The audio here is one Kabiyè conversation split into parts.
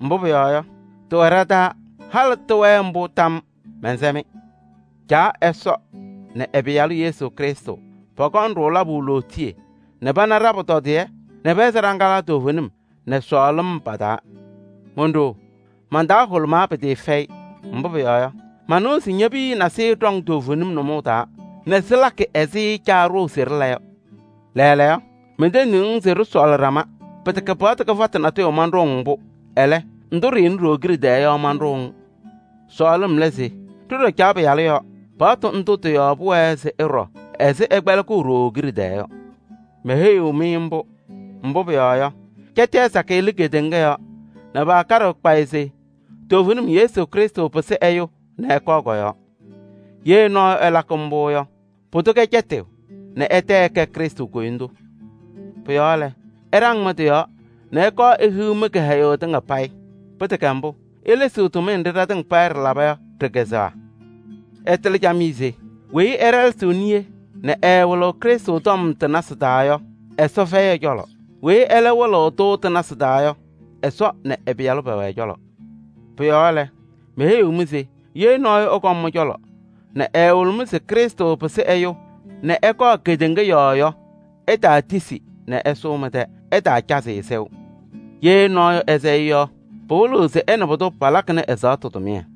Mbʋ pʋyɔɔ yɔ, tɩwɛ ɖa-taa, halɩ tɩwɛɣ mbʋ tam yɔɔ. Mɛnsɛ-mɩ: Caa Ɛsɔ nɛ ɛ-Pɩyalʋ Yesu Krɩstʋ, pɔkɔŋ-ɖʋ labʋ lootiye nɛ pana ɖa-pʋtɔdɩyɛ nɛ pɛhɛzɩ ɖa-laŋa toovenim nɛ sɔɔlɩm pa-taa. Ɖo-ɖoo! Man-taa hʋlʋmaa pɩtɩɩfɛyɩ, mbʋ pʋyɔɔ yɔ, manɩwa se ñe-piya nasɩyɩ ɖɔŋ toovenim nʋmɔʋ taa nɛ sɩlakɩ ɛzɩ Caa ɖʋʋ se ɖɩla yɔ. Lɛɛlɛɛyɔ lɛ, mentendiɣ-ŋ se ɖɩsɔɔlɩ ɖama. Pɩtɛkɛ paɣtʋ kɩfatʋ natʋyʋ manɖʋʋ-ŋ mbʋ, ɛlɛ, ndʋ ɖɩɩnɩ ɖooo kiɖe tɛɛ yɔ manɖʋʋ-ŋ. Sɔɔlɩm lɛ se ɖɩɖɔ Caa paɣtʋ yɔɔ. Paɣtʋ ndʋ tɩ-yɔɔ pʋwɛɛ se ɩɖɔ ɛzɩ ɩkpɛlɩkʋʋ ɖooo kiɖe tɛɛ yɔ. Meheyiɣ-mɩ mbʋ, mbʋ pʋyɔɔ yɔ, cɛtɩyaa sakɩyɛ lɩ kedeŋa yɔɔ nɛ paakaɖɩɣ kpayɩ se toovenim Yesu Krɩstʋ pɩsɩ ɛyʋ nɛ ɛkɔɔ kɔ-yɔɔ. Ye nɔɔyʋ ɛlakɩ mbʋ yɔ, pʋdʋ kɛ cɛtɩyʋ nɛ ɛtɛ ɛkɛ Krɩstʋ koyindu. Pʋ-yɔɔ lɛ, ɩɖaŋ mɩ-tɩ yɔɔ nɛ ɩkɔɔ ɩmʋ mɩ-kɩhɛyʋ tɩŋa payɩ. Pɩtɛkɛ mbʋ, ilesiɣ tʋmɩyɛ nɖɩ ɖɩtɩŋa payɩ ɖɩlaba yɔ ɖɩ-kazʋwa. Ɩtɩlɩ camɩyɛ se weyi ɛɖɛlɛsɩɣ niye nɛ ɛɛwɩlɩɣ Krɩstʋ tɔm tɩ-nasɩ taa yɔ, Ɛsɔ fɛyɩ ɛ-cɔlɔ. Weyi ɛlɛ wɩlɩɣ-tʋ tɩ-nasɩ taa yɔ, Ɛsɔ nɛ ɛ-Pɩyalʋ pɛwɛ ɛ-cɔlɔ. Pʋ-yɔɔ lɛ, meheyiɣ-mɩ se ye nɔɔyʋ ɛkɔm mɩ-cɔlɔ nɛ ɛɛwɩlɩɣ-mɩ se Krɩstʋ pɩsɩ ɛyʋ nɛ ɛkɔɔ kedeŋa yɔɔ yɔ, ɩtaatisi nɛ ɛsʋʋ mɩ-tɛ, ɩtaacazɩ-ɩ sɛʋ. Ye nɔɔyʋ ɛsɛ-ɩ yɔ, pɩwɩlɩɣ se ɛ nɛ pʋdʋ palakɩnɩ ɛ-ɛzaɣtʋ tʋmɩyɛ.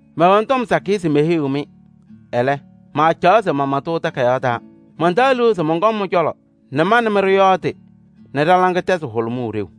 Mɛwɛnɩ tɔm sakɩyɛ se meheyiɣ-mɩ, ɛlɛ, maacaɣ se mama-tʋ takayaɣ taa. Mantaɣ liu se mɔnkɔŋ mɩ-cɔlɔ nɛ ma nɛ mɩ ɖɩyɔɔdɩ nɛ ɖa-laŋa tɛzɩ hʋlʋmʋʋ ɖeu.